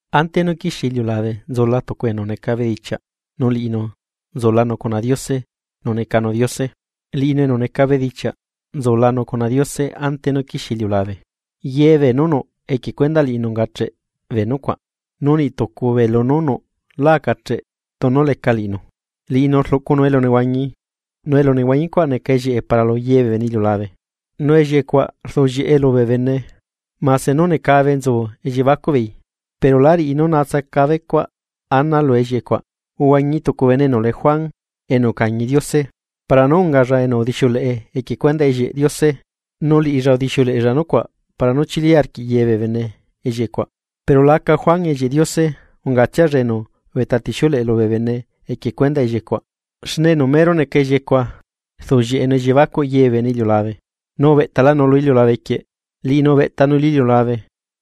Ante nú quixie iliulabe nzula tucu enu neca bedichiaꞌ, nu liꞌinu nzulanu cuna Diose nu necanu Diose. Liꞌinu enu neca bedichiaꞌ nzulanu cuna Diose ante nú quixie iliulabe. Ye beenú nuꞌ equie cuendaꞌ liꞌinu ungacheꞌ bee nucuaꞌ. Nu niꞌtucu bee lunú nuꞌ lá acacheꞌ tunu leca liꞌinu. Liꞌinu rluꞌcunu elunehuañi, nu elunehuañicuaꞌ neca ellieꞌe para lu yebee bene iliulabe. Nu ellieꞌe cuaꞌ rduꞌllieꞌe lubee bene mase nú necabe nzu elliebacuꞌbeei, pero lá riꞌi nú natsacabecuaꞌ ana lu ellieꞌecuaꞌ. Uhuañi tucu bene enu lee Juan, enu ucañi Diose, para nú ungalla enu udixiuleꞌe equie cuendaꞌ ellieꞌ Diose nu liꞌilla udixiuleꞌella nucuaꞌ para nú chili arquiꞌ yebee bene ellieꞌe cuaꞌ. Pero la aca Juan ellieꞌ Diose, ungatsialla enu ubeꞌtatixiuleꞌe lubee bene equie cuendaꞌ ellieꞌecuaꞌ. Xne enu mero neca ellieꞌecuaꞌ, rduꞌllieꞌenu elliebacuꞌ yebee bene iliulabe, nu ubeꞌtalanu lu iliulabe quieꞌ. Liꞌinu ubeꞌtanu lu iliulabe,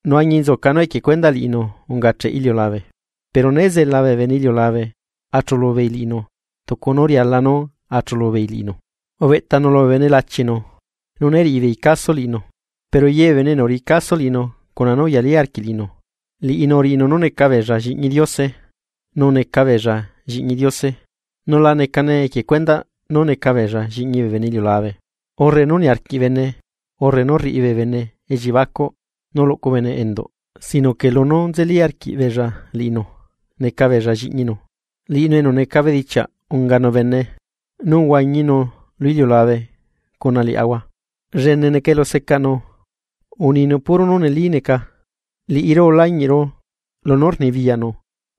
nu añinzuca nú equie cuendaꞌ liꞌinu ungacheꞌ iliulabe, pero né zela bee bene iliulabe achuꞌlubeei liꞌinu tucu nú riala nú achuꞌlubeei liꞌinu. Ubeꞌtanu lubee bene lachinu, nu né riꞌibeei caso liꞌinu. Pero yebee bene enu uriꞌi caso liꞌinu cuna nú uyalí arquiꞌ liꞌinu, liꞌinu uriꞌinu nú neca beella lliꞌñi Diose. Nu neca beella lliꞌñi Diose, nu la necane equie cuendaꞌ nú neca beella lliꞌñi bene iliulabe, urre nú niarquiꞌ bene urre rriꞌi bee bene elliebacuꞌ nú luꞌcu bene enduꞌ sino que lunú nzelíla arquiꞌbeella liꞌinu neca beella lliꞌñinu. Liꞌinu enu neca bedichiaꞌ unganu bene, nu uhuañinu lu iliulabe cuna liaꞌahua, llene neca elusecaꞌnu, uninu puro nú neli neca. Liꞌiru ulañiꞌru lunú rnibiyaꞌnu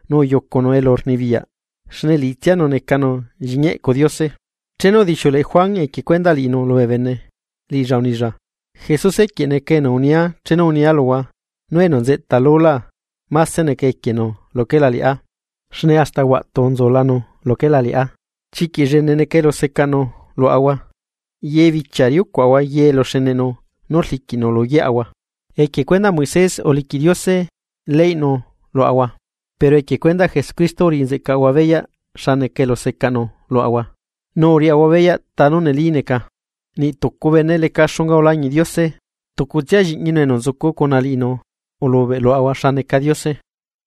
nu uyucunu elurnibiyaꞌ, xne liꞌitsianu necanu Lliꞌñi eꞌcu Diose. Chenu udixiuleꞌe Juan equie cuendaꞌ liꞌinu lubee bene, liꞌilla unilla: ―Jesuse quieꞌ neca enu unia chenu unia luhua nú enu nzeꞌta lulá máse neca equienu luquela liꞌá, xne hasta huaꞌtu nzulanu luquela liꞌá. Chiquiꞌ llene neca elusecaꞌnu luaꞌahua, yebichia riucuaꞌahua ye eluxeneꞌnu nú rliquiꞌnu luyeaꞌahua. Equie cuendaꞌ Moisés uliquiꞌ Diose leyꞌnu luaꞌahua. Pero equie cuendaꞌ Jesucristo uriꞌi nzeꞌcaꞌahua beyaꞌ xa neca elusecaꞌnu luaꞌahua, nu uriaꞌahua beyaꞌ ta nú neli neca. Niꞌtucu bene leca xunga ulañiꞌ Diose, tucutsia Lliꞌñinu enu nzucu cuna liꞌinu ulubeꞌ luaꞌahua xa neca Diose.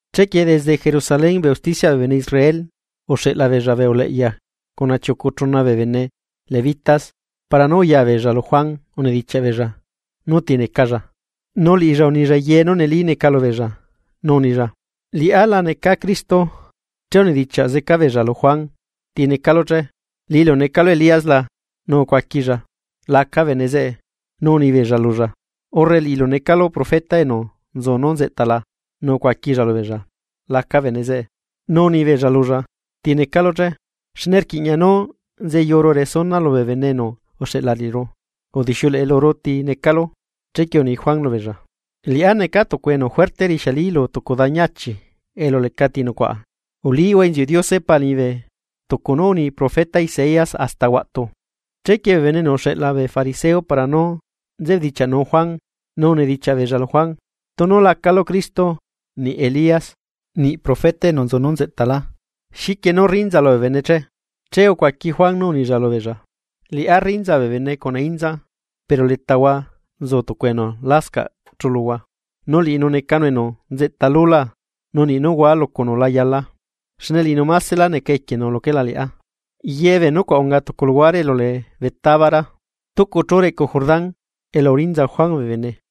Chequie desde Jerusalén bee usticiaꞌ bee bene Israel, uxeꞌla beella bee uleꞌya cuna chiucu chuna bee bene Levitas para nú uya beella lu Juan Bautista unidichiaꞌ beella nú ti necalla. Nu liꞌilla unilla ye nú neli neca lubeella, nu unilla: ―Liꞌá la neca Cristo. Che unidichiaꞌ zeca beella lu Juan: ―¿Ti necalu che? ¿Liꞌilu necalu Elías la? Nu ucuaquilla: ―Laca bene zeꞌe. Nu unibeella lulla: ―¿Urre liꞌilu necalu profeta enu nzu nú nzeꞌta la? Nu ucuaquilla lubeella: ―Laca bene zeꞌe. Nu unibeella lulla: ―¿Ti necalu che? Xne rquiꞌña nú nzeyuru resuna lubee bene enu uxeꞌla liꞌiru. ¿Udixiuleꞌe luru ti necalu? Chequie uni Juan lubeella: ―Liꞌá neca tucu enu juerte rixiali lu tucu dañi achi elu lecati nucuaꞌa: “Ulihua inziuꞌ Diose Pa liñibe” ―tucu nú uni profeta Isaías hasta huaꞌtu. Chequie bee bene enu uxeꞌla bee fariseo para nú nzebedichiaꞌnu Juan, nú unedichiaꞌ beella lu Juan: ―Tunu lacalu Cristo, niꞌ Elías, niꞌ profeta enu nzu nú nzeꞌtalá, ¿xiquie nú rrinzalu bee bene che? Che ucuaqui Juan nú unilla lubeella: ―Liꞌá rrinza bee bene cuna inza, pero letahua nzu tucu enu lascaꞌ chuluhua, nu liꞌinu necanu enu nzeꞌta lulá, nu niꞌ nú hua lucunu la yalaa, xne liꞌinu maselá neca equienu luquela liꞌá. Yebee nucuaꞌ unga tucu luhuare elu lee Betábara, stucu chú reꞌcu Jordán, elu urinza Juan bee bene.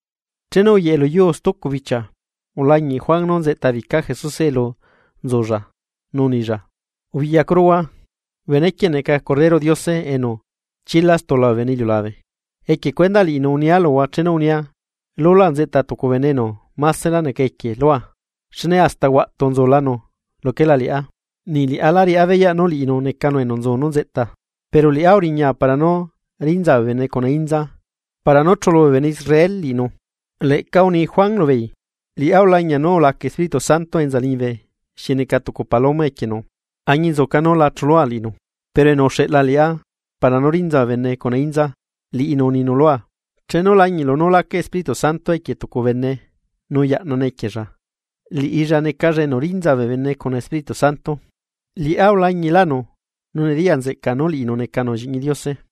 Chenu uyeꞌe luyuu stucu bichia, ulañiꞌ Juan nú nzeꞌtabica Jesuse elu nzulla, nu unilla: ―¡Ubiꞌyacuruhua, benequieꞌ neca Corderoꞌ Diose enu chila stula bee bene iliulabe! Equie cuendaꞌ liꞌinu unia luhua chenu unia: “Lulá nzeꞌta tucu bene enu másela neca equie lua, xne hasta huaꞌtu nzulanu luquela liꞌá.” Niꞌ liꞌá lá riꞌá beyaꞌ nú liꞌinu necanu enu nzu nú nzeꞌta, pero liꞌá uriñaa para nú rinza bee bene cuna inza para nú chulu bee bene Israel liꞌinu. Leꞌca uni Juan lubeei: ―Liꞌá ulañia nú ulaca Espíritu Santo enza liñibe xi neca tucu paloma equienu. Añinzuca nú lá chulua liꞌinu, pero enu uxeꞌla liꞌá para nú rinza bee bene cuna inza, liꞌinu uninu lua: “Chenu lañiꞌlu nú laca Espíritu Santo equie tucu bene nu yaꞌnane equiella, liꞌilla necalla enu rinza bee bene cuna Espíritu Santo.” Liꞌá ulañilánu, nu nediya nzeꞌca nú liꞌinu necanu Lliꞌñi Diose.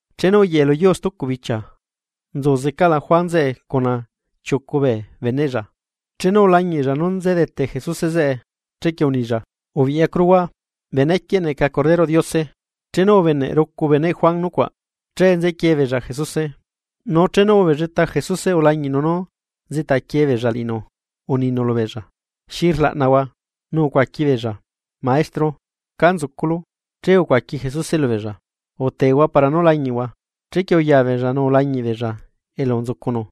Chenu uyeꞌe lu yuu stucu bichia, nzu zecaꞌla Juan zeꞌe cuna chiucu bee beneꞌlla. Chenu ulañiꞌlla nú nzedete Jesuse zeꞌe, chequie unilla: ―¡Ubiꞌyacuruhua! Benequieꞌ neca Corderoꞌ Diose. Chenu ubeneꞌ rucu beneꞌ Juan nucuaꞌ, che nzequie beella Jesuse. Nu chenu ubelleta Jesuse, ulañiꞌnu nú nzeꞌtaquie beella liꞌinu, nu uninu lubeella: ―¿Xi rlaꞌnahua? Nu ucuaqui beella: ―Maestro, ¿cá nzuculu? Che ucuaqui Jesuse lubeella: ―Utehua para nú lañiꞌhua. Chequie uya beella nu ulañiꞌ beella elu nzucunu,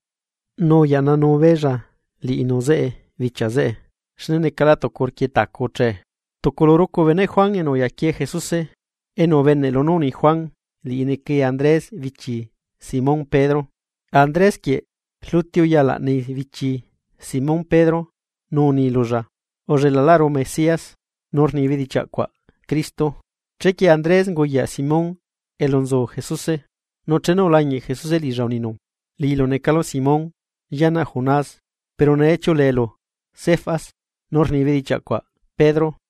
nu uyaꞌnanu beella liꞌinu zeꞌe bichia zeꞌe, xne necala tucu rquietacu uchee. Tucu lu rucu beneꞌ Juan enu uyaquie Jesuse, enu ubeneꞌ lunú uni Juan, liꞌi necai Andrés bichi Simón Pedro. Andrés quieꞌ rluti uya laꞌnai bichi Simón Pedro nu uni lulla: ―Ullelaꞌlaꞌru Mesías ―nu rni bedichiaꞌ cuaꞌ Cristo. Chequie Andrés unguyaꞌ Simón elu nzu Jesuse, nu che ulañiꞌ Jesuse liꞌilla nu uninu: ―Liꞌilu necalu Simón, llianaꞌ Jonás, pero nee chiuꞌuleelu Cefas ―nu rni bedichiaꞌ cuaꞌ Pedro.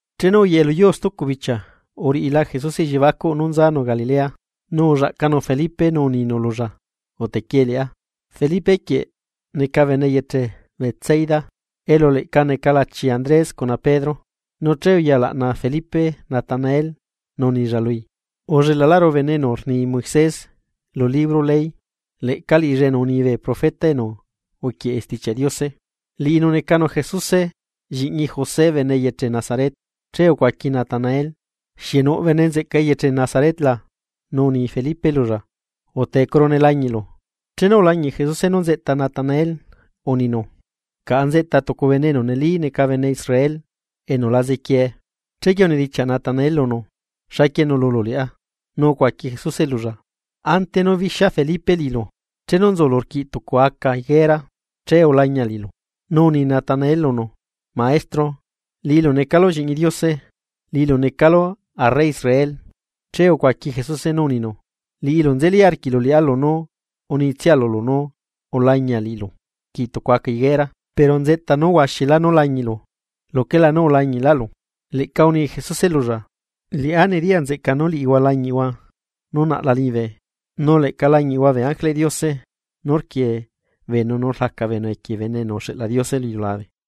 Chenu uyeꞌe luyuu stucu bichia uriꞌila Jesuse elliebacuꞌ nú nzanu Galilea, nu ullaꞌcanu Felipe nu uninu lulla: ―Utequie liꞌá. Felipe quieꞌ neca bene eyeche Betsaida, elu leꞌca neca lachi Andrés cuna Pedro. Nu che uya laꞌna Felipe Natanael, nu unilla lui: ―Ullelaꞌlaꞌru bene enu rni Moisés lu libro ley, leꞌca liꞌilla enu uni bee profeta enu uquieꞌe Stichiaꞌ Diose. Liꞌinu necanu Jesuse lliꞌñi José bene eyeche Nazaret. Che ucuaqui Natanael: ―¿Xieꞌ nuꞌ bene nzeꞌca eyeche Nazaret la? Nu uni Felipe lulla: ―Utecuru ne lañiꞌlu. Chenu ulañiꞌ Jesuse nú nzeꞌta Natanael, uninu: ―Caꞌa nzeꞌta tucu bene enu neli neca bene Israel, enu la zequiee. Chequie unidichiaꞌ Natanael lunu: ―¿Xaquie nuꞌlulu liꞌá? Nu ucuaqui Jesuse lulla: ―Ante nú bixia Felipe liꞌilu chenu nzulu rquiꞌ tucu aca higuera, che ulañia liꞌilu. Nu uni Natanael lunu: ―Maestro, ¡liꞌilu necalu Lliꞌñi Diose, liꞌilu necalu arre Israel! Che ucuaqui Jesuse nú uninu: ―Liꞌilu nzeli arquiꞌlu liꞌá lunú unitsia lulu nú ulañia liꞌilu rquiꞌ tucu aca higuera. Pero nzeꞌta nú huaxilá nú lañiꞌlu luquela nú ulañiꞌlalu. Leꞌca uni Jesuse lulla: ―Liꞌá nediyanzeꞌca nú liꞌihua lañiꞌhua nú naꞌla liñibe, nu leꞌca lañiꞌhua bee ángeleꞌ Diose, nú rquiee beenu nu rlaca beenu equie Bene enu uxeꞌla Diose lu iliulabe.